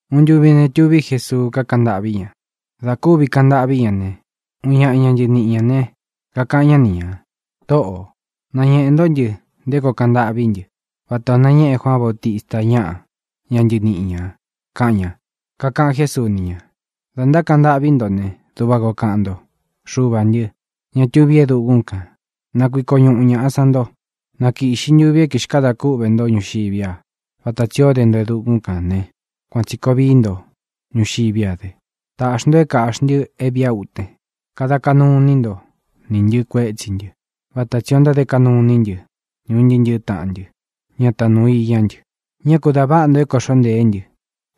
Uun ntuvi ne, tuví Jesuu, kakaꞌan ntâꞌví ña. Dā kúvi kaꞌan ntâꞌví ña ne, uun ñaꞌa ña ntɨniꞌi ñā ne, kakaꞌan ñá ni ñā: —Tōꞌó, nañeꞌē ntó ntɨ nté koo kaꞌan ntâꞌví ntɨ vatā o nañéꞌe Juaan Bautista ñaꞌa, ña ntɨníꞌi ñā —kaꞌan ña. Kakaꞌan Jésuu ni ña: —Dā ntákaꞌan ntâꞌví nto ne, duꞌva koo kaꞌan nto: Xuvā ntɨ́, ña tuví e dukún kān, na kuiko ñuꞌu ñāꞌa sán nto. Na kīꞌxi ntuvi é kixkadā kúꞌvē ntó ñuxiví a. Vata tsī ó de nto e dukún kān ne, kuān tsi koo vií nto ñuxiví a dɨ. Taꞌxī nto é kāꞌxi ntɨ é vīꞌa é ūten. Kada kaꞌnu iní nto nī ntɨ kuétsī ntɨ, vata tsī ó ntáde kaꞌnu iní ntɨ ni un ntɨꞌɨ tāꞌan ntɨ, ña tanuu iñá ntɨ. Ñá ku dā váꞌa ntō é kōꞌxó ntēé ntɨ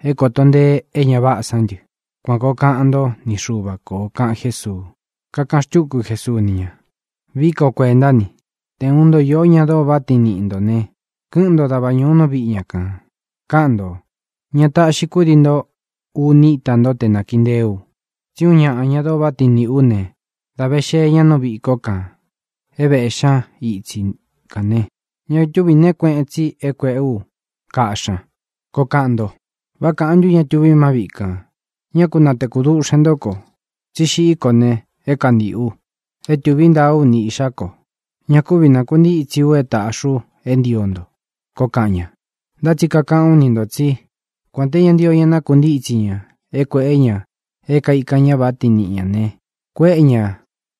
é kōto ntee é ña váꞌā sán ntɨ. Kuan kōo kaꞌan ntó ni Xuva kō —kaꞌan Jésuu. Kakaꞌan xtúku Jesuu ni ña: —Vií ka o kuēntá ni: Te ūun ntó īó ña dóo váꞌa tiin niꞌi ntō ne, kɨ́ꞌɨn nto dava ñūu nú viꞌi ña kān, káꞌan ntō: “Ña táꞌxi kudii nto uni íta nto te nākiꞌi nteé u, Tsí uun ñaꞌa ña dóo váꞌa tiin niꞌī ú ne, dā ve xee ña nú viꞌī kó kān é vēꞌxí ña itsi kān ne, ña túvī neé kueꞌen tsi é kuēꞌe ú kaꞌxí ña”, koo kaꞌan nto. ¿Vá kāꞌan ntú ña tuvi má viꞌi kān: “Ñá ku natēku duꞌxen ntó ko, tsi xiꞌí ko ne, é kantiꞌu. E tuví ntāá u ni īꞌxá ko. Ña kúvi nākuntítsi u é tāꞌxi u é ntio nto”, koo kaꞌan ña? Ntá tsi kakaꞌán u ni ntō tsí, kuān té ña ntio ña nakuntítsi ña é kuēꞌé ña é kaikán ña váꞌa tiin niꞌi ñā ne, kuéꞌe ña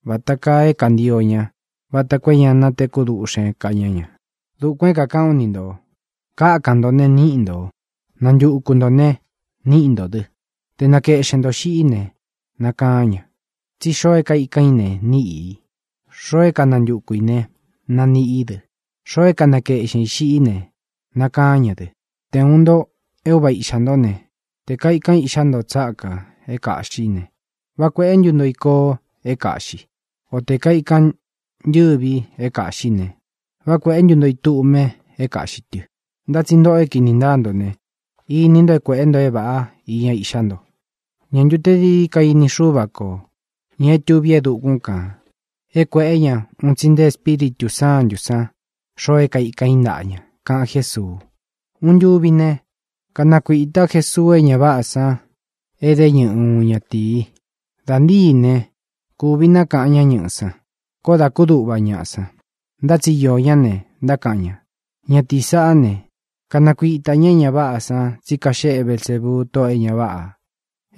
vata kaa é kantio ña vata koo é ña natekú duꞌxen ká ña ña. Dukuān é kākaꞌán u ni ntō: Kákan ntō ne, níꞌi ntō. Nantuku ntō ne, naniꞌi ntó dɨ. Te nakeꞌxen ntō xiꞌí ne, nakaán ña. Tsí xoo é kaikan ī ne, níꞌi i. Xoo é kanantuku ī ne, naniꞌi í dɨ. Xoo é kanakeꞌxen ī xiꞌí ne, nakaán ña dɨ. ʼTe ūun nto é uva īꞌxá nto ne, tē kaikan iꞌxá nto tsákā é kāꞌxí ne, ¿vá kuēꞌé ntu nto i koo é kāꞌxi? O tē kaikan ntɨ́vi é kāꞌxí ne, ¿vá kuēꞌé ntu nto i tduꞌme é kāꞌxi tɨ? Ntá tsi ntōꞌo é kini ntáa ntō ne, ini nto é kuēꞌé nto é vāꞌá iña iꞌxá nto. ¿Ñā ntu te dií dií ka ini Xúva kō, ña é tuví e dukún kān, é kuēꞌé ña un tsi nte Espíritū Sántū san xoo é kaikan i ntáꞌa ña? —kaꞌan Jésuu. Uun ntuvi ne, kanakuītá Jesuu é ña váꞌā san e dé ñɨꞌɨ uun ñaꞌa ñatīi. Dā ntíi ne, kūvi nákaꞌan ñá ñɨꞌɨ̄ san. Koó dā kúduꞌva ñaꞌa san. Ntá tsi iō ñá ne, ntákaꞌan ña: —Ñatīí saꞌá ne, kanakuitā ñá é ña váꞌā san tsí kaxeꞌe Belsēbuu, tóꞌō e ña váꞌā,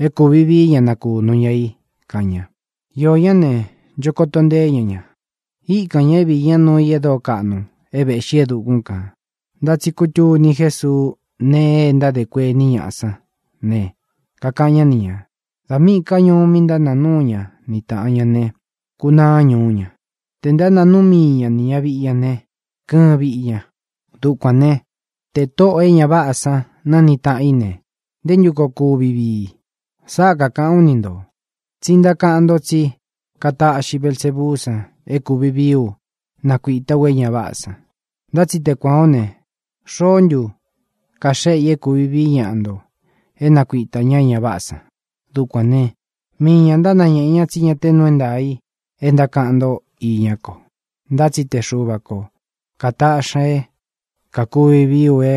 é kūvi vií ña nakūnu ña i —kaꞌan ña. Iō ñá ne, ncho koto nteé ña ña. Íkan ñā é viī ñá nuu i e dóo kaꞌnu é vēꞌxí e dukún kān. Ntá tsi kutuni Jésuu nee e ntádē kuení ñaꞌa sán ne, kakaꞌan ñá ni ñā: —Dā míꞌī ká ñuú mi ntánāa núu ña ni tāꞌan ña ne, kunaá ñuú ña. Tē ntánāa núu mii ña nī ña viꞌi ña ne, kɨɨn viꞌi ña. Dukuān né, tē tóꞌō e ña váꞌā sán naa ni tāꞌan í ne, ¿nté ntu koo kuvi vii? Sáꞌa kakāꞌán u ni ntō, tsi ntákaꞌan nto tsí kataꞌxi Belsebuú san é kūvi vií u nákuīta ú e ña váꞌā san. Ntá tsi te kuān ó ne, ¿xoó ntu kaxéꞌe ī é kūvi vií ñaꞌa nto é nakuitā ñá é ña váꞌā san? Dukuān né, mii ñā ntánañēꞌe ña tsí ña te nuu é ntaā i e ntákaꞌan ntó iñá ko. Ntá tsi te Xuva ko kātaꞌxi ña é kākuvi vií u é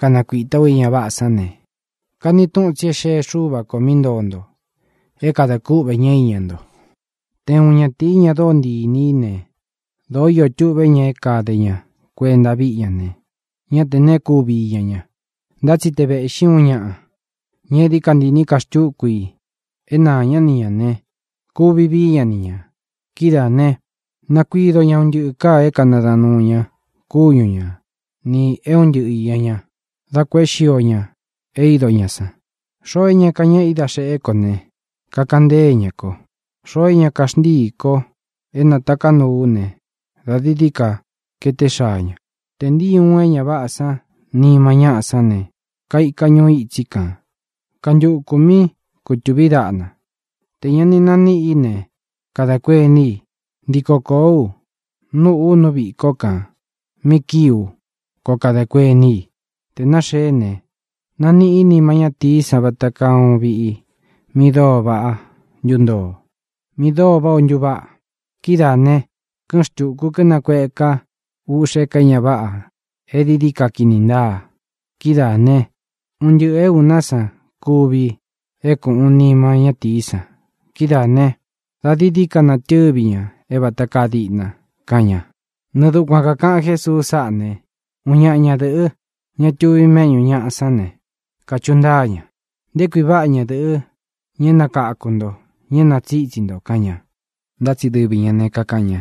kanakuītá u é ña váꞌā san ne, kani túꞌun tsi é xee Xúva kō mí ntoo nto é kadā kúꞌvē ñá iña nto. ʼTe uun ñatīí, ña e dóo ntii inī í ne, dōó iō tuꞌvé ña é kade ña kuenta víꞌi ña ne, ñá te neé kuvi iña ña. Ntá tsi te vēꞌxí uun ñaꞌa, ña é dií ka ntii īní ka xtúku i é naā ñá ni ñā ne, kuvi vií ña ni ñā. Kidáā ne, nakuido ña un ntɨꞌɨ káā é kanadaꞌan nūu ña kúñu ña nī é un ntɨꞌɨ īña ñá, dá kuēꞌé xio ña é ido ñā san. ʼXoo é ña kañéꞌe i da xeꞌe kó ne, kakaꞌan ntée ña ko. Xoo é ña kaxntíī ko é natāká u ne, da dií ka kaeté xaa ña. ʼTē ntíi uun é ña váꞌā nima ñáꞌa sán ne, kaika ñuu itsí kān, kantukū míꞌi kūtuví daꞌna. Tē ña ni naníꞌi í ne, kada kuení i: “Ntiko kōó u, núꞌū u nú viꞌī kó kān mí kii u”, koo kada kuení i. Te nāxeé ne, naniꞌí i nima ñátīí san vata kaa uun viꞌi mí dóo váꞌa ntúntoo, mí dóo váꞌā o ntúvaꞌa. Kidáā ne, kɨ́ꞌɨn xtūku kínakueka úꞌxē ká e ña váꞌā e dií dií ka kini ntáa. Kidáā ne, un ntɨꞌɨ̄ é ūná san kɨ́ꞌvi é kuꞌun nima ñátīí san. Kidáa ne, dā dií dií ka natɨ́vi ña é vata kaa díꞌna —kaꞌan ña. Nɨɨ dukuan kākaꞌan Jésuu sáꞌā né, uun ñaꞌa ñadɨ̄ꞌɨ́, ña tuvi méꞌñū ñaꞌa sán ne, kachuꞌu ntáa ña: —¡Nté kui váꞌa ñadɨ̄ꞌɨ, ña é nakáku nto, ña é nātsitsí nto! —kaꞌan ña. Ntá tsi dɨvi ñā ne, kakaꞌan ña: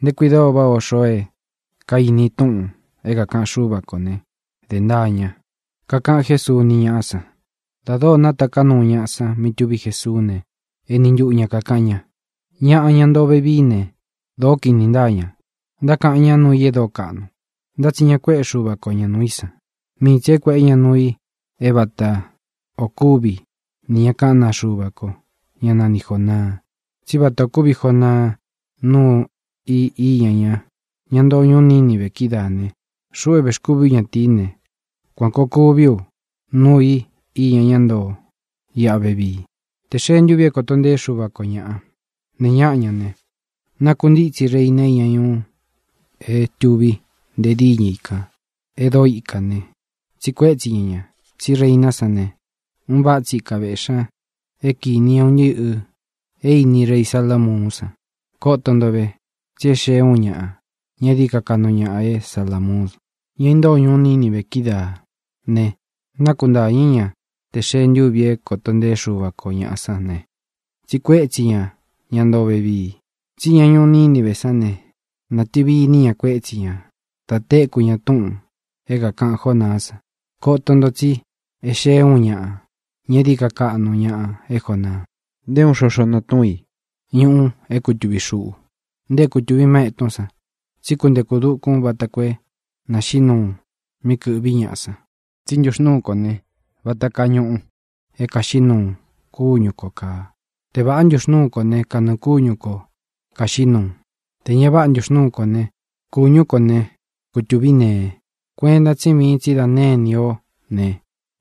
—¡Nté kui dóo váꞌā o xoo é kainí i túꞌūn é kākaꞌan Xúva ko ne, dē ntaa ña! —kaꞌan Jésuu ni ñáꞌa san. Dā dóo nátaká nuu ñaꞌa san mí tuví Jesuú ne, eni ntuꞌu ña kākaꞌan ña: —Ñaꞌa, ña ntoo vevií ne, dōó kini ntáa ña. Ntaíkān ñá nuu i e dóo kaꞌnu, ntá tsi ña kuéꞌe Xuva ko ña nuu i san, mii tsi é kuēꞌé ña nuu i é vata ō kúvi nī ña kaꞌán naa Xuva ko, ñá nani Jōnaa. Tsí vata ō kúvi Jonaa nuu i iña ñaꞌa, ña intóo ñuú Nínive kidáā ne, xuꞌu é vēxkúvi ú ñatīí ne, kuan kōo kuvi ú nuu i iña ñá ntoo iꞌa vevii. Tē xee ntúvī é kōto nteé Xuva ko ñāꞌa, ne ñáꞌa ña ne, nakuntítsi reina iña ñuu é tuví nte díñɨ i kān e dóo ikā ne, tsiꞌi kuétsi ña ña, tsí reiná san ne, un váꞌa tsi ika vēꞌxí ña é kīni ñá un ntɨꞌɨ̄ é īní rei Salamuún san. Koto nto ve, tsí e xee úun ñaꞌa, ña é dií ka kaꞌnu ñaꞌa é Salāmuun. Ña intóo ñuu Nínive kidáā ne, nakuntáñɨ̄ ñá tē xee ntúvi é koto nteé Xuva ko ñāꞌa sán ne, tsiꞌi kuétsi ña ña ntoo vevii. Tsí ña ñuu Nínive sán ne, nātɨvi iní ña kuétsi ña dā téku ña túꞌūn é kākaꞌan Jonaá san. Koto nto, tsí e xée ūun ñaꞌa, ña é dií ka kaꞌnu ñaꞌa é Jonaa. ʼNté uun xoxo natúun i ñuꞌu é kutuvī xuꞌu, nte é kutuvi má ētún san, tsí kuntekū dukun vata koo é naxīꞌi nuu mí kɨ̄ꞌví ñaꞌa san. Tsí ntuxnuu kó ne, vata kaa ñuꞌu é kāxiꞌí nuu kúñu kō kaa. Te vāꞌá ntuxnuu kó ne, kanɨɨ̄ kúñu ko kāxiꞌí nuu. Tē ña váꞌa ntuxnuu kó ne, kūñú ko ne, kutuví nee. Kuenta tsí viin tsí dā née ini o ne,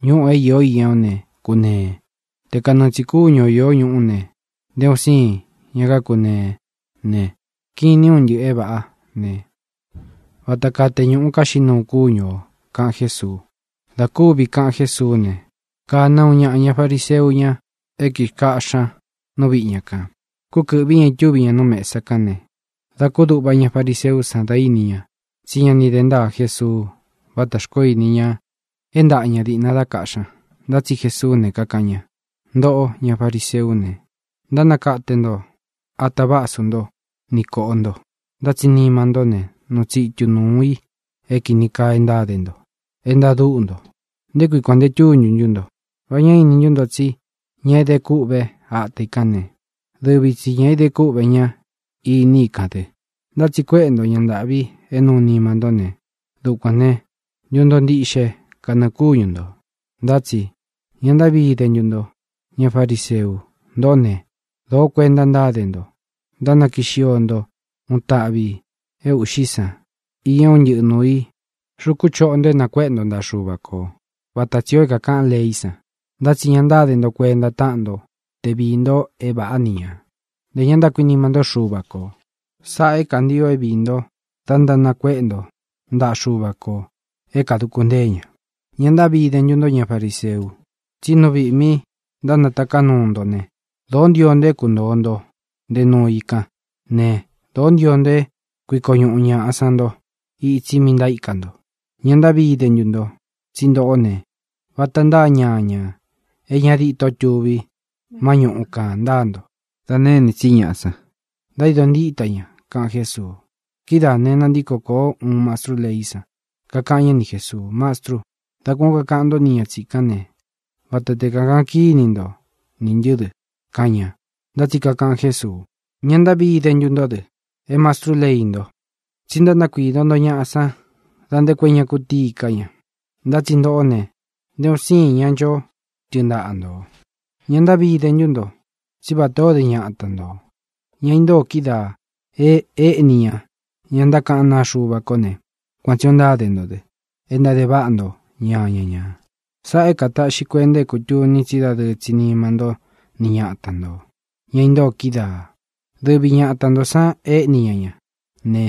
ñúꞌū é īo íña o ne, kūnee. Te kanɨɨ tsī kúñu o īó ñuꞌu ne, nté un siin ña kákunee ne, kinin un ntɨꞌɨ̄ é vāꞌá ne, vata kaa te ñuꞌu kaxiꞌí nuu kúñu ō —kaꞌan Jésuu. Dā kúvi kaꞌan Jésuú ne, kāna uun ñaꞌa ña fariseú ña é kīkáꞌxi ña nú viꞌi ña kān. Kúkɨ̄ꞌví ña, itúvi ña nú mesa kán ne, dā kúduꞌva ña fariseú san dá ini ña tsí ña ni dē ntáa Jesuu vátā xkoó ini ña é ntaꞌa ña dīꞌna dá kaꞌxí ña. Ntá tsi Jesuú ne, kakaꞌan ña: —Ntōꞌó, ña fariseú ne, ntánakate nto ata vásu ntó ni kōꞌo nto, ntá tsi nima ntó ne, nuu tsitu nuū i é kīni kaa e ntáde nto, e ntadúꞌu nto. ¡Nté kui kuān nte túntu ntú nto! ¿Vá ña íni ntu nto tsí ña é de kúꞌve ata i kān ne, dɨvi tsi ñā é idé kúꞌvē ña iní i kān dɨ? Ntá tsi kuéꞌe nto ña ntāꞌvi é nuu nima ntó ne, dukuān né, ntuntoo ntiꞌxe kanɨɨ̄ kúñu ntō. ʼNtá tsi ¡ña ntaꞌví ide ntú nto, ña fariseu! Ntōꞌó ne, dōó kuenta ntáde nto ntánakii xio nto uun taꞌvi ī é ūꞌxí san iña é un ntɨꞌɨ nuū i xuku choꞌo nto é nakuéꞌe nto ntaꞌa Xuva kō vata tsī o é kākaꞌan leí san, ntá tsi ña ntáde nto kuenta táꞌan nto te viī nto é vāꞌá ni ñā; ntē ña ntákuinima ntó Xuva kō. Sáꞌā é kantio é viī ntó da ntánakuéꞌe nto ntaꞌa Xuva kō é kāduku ntée ña. ʼ¡Ña ntaꞌví ide ntú nto, ña fariseu!, tsi nú viꞌī mí ntánataká nuu nto ne, dōó ntio nto é kuntōo nto nte nuu i kán ne, dōó ntio nto é kuiko ñuꞌu ñaꞌa san nto itsi mí ntaíka nto. ʼ¡Ña ntaꞌví ide ntú nto! tsí ntōꞌó ne, vata ntáa ñañā é ña dîtó tuvi má ñuꞌu kān ntáa nto. Dā nêní tsi ñaꞌa san, ntaído ntíta ña —kaꞌan Jésuu. Kidáā ne, nantíko kōó uun mastrú leí san, kakaꞌan ña ni Jésuu: —Mastru, dá kuān ó kakaꞌan ntó ni ña tsīkán ne, vata te kakaꞌan kíni nto nī ntɨ́ dɨ —kaꞌan ña. Ntá tsi kakaꞌan Jésuu: —¡Ña ntaꞌví ide ntú nto dɨ, é mastrú lei nto! tsí ntánakuído nto ñaꞌa san da nte koo é ña kutíi ká ña. Ntá tsi ntōꞌó ne, nté un siin ña nchó tɨɨn ntaꞌa nto. ʼ¡Ña ntaꞌví ide ntú nto! tsí vatā o dé ñata ntō, ña intóo kídaā e éꞌní ña ña ntákaꞌán naa Xuva ko ne, kuan tsī ó ntáde nto dɨ e ntáde váꞌa nto ñaña ñā. Sáꞌā é kataꞌxi kuenta é kūtuni tsí dadɨɨ tsi nima ntó ni ñata ntō, ña intóo kídaā. Dɨvi ñata ntō san éꞌní ña ña ne,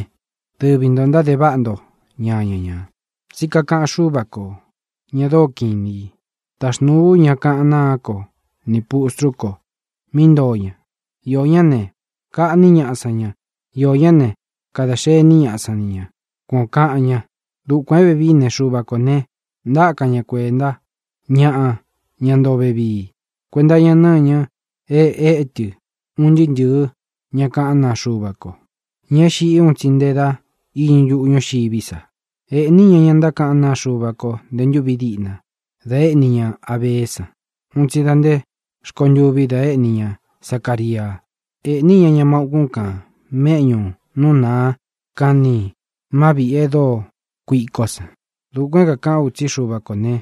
dɨvi ntō ntáde váꞌa nto ñaña ñā. ʼTsí kakaꞌan Xúva kō, ña dóo kiꞌin inī: “Taxnūu ú ña kaꞌán naa kó ni pūstrú ko mí ntoo ña. Iō ñá ne, kaꞌní ñaꞌa san ña. Iō ñá ne, kada xení ñaꞌa san ni ñā.” Kuan ō kaꞌan ña. Dukuān é vevií ne, Xuva kō ne, ntákan ñá kuenta ñáꞌa, ña ntoo vevii, kuenta iña nɨ́ñɨ e étɨ un ntɨɨ́ ntɨ̄ɨ́ ña kaꞌán naa Xuva ko, ña é xiꞌi un tsi nté da iñɨ ntuꞌu ñúxiví sa. Ēꞌní ña ña ntákaꞌán naa Xuva ko nte ntúvi diꞌna da éꞌni ña Abeé san un tsi da nte rkontûvi da éꞌni ña Zacaria. Ēꞌní ña ña má ūkún kān méꞌñū nú naa kan ni má viꞌī e dóo kuíkó san. Dukuān é kākaꞌán u tsí Xuva kō ne,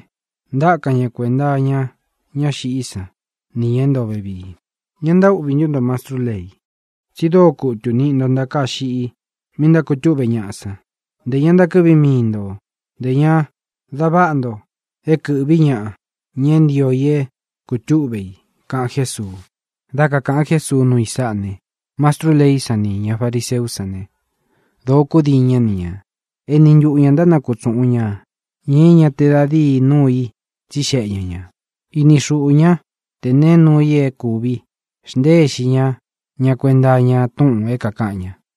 ntákan ña kuenta íña ñá xiꞌí san nī ña é ntoo vevii. ʼ¡Ña ntaꞌví ntu nto, mastrú lei!, tsi dóo kutu niꞌi nto ntakāá xiꞌi mí ntákūtúꞌve ñaꞌa san. Ntē ña ntakɨ́ꞌvi mii nto, ntē ña da váꞌa nto é kɨ̄ꞌví ñaꞌa, ña é ntio i é kūtúꞌve i —kaꞌan Jésuu. Dá kakāꞌan Jésuu nuu i sáꞌā ne, mastrú leí san nī ña fariseú san ne, dōó kudiin ñá ni ñā. Eni ntuꞌu ñā ntánakutsuꞌun ña ñā é ña te da díi nuu i tsixeꞌe ña ñā. Ini xuꞌū ñá te neé nuū i é kūvi xnteé ixi ñá ña kuenta iña túꞌūn é kākaꞌan ña.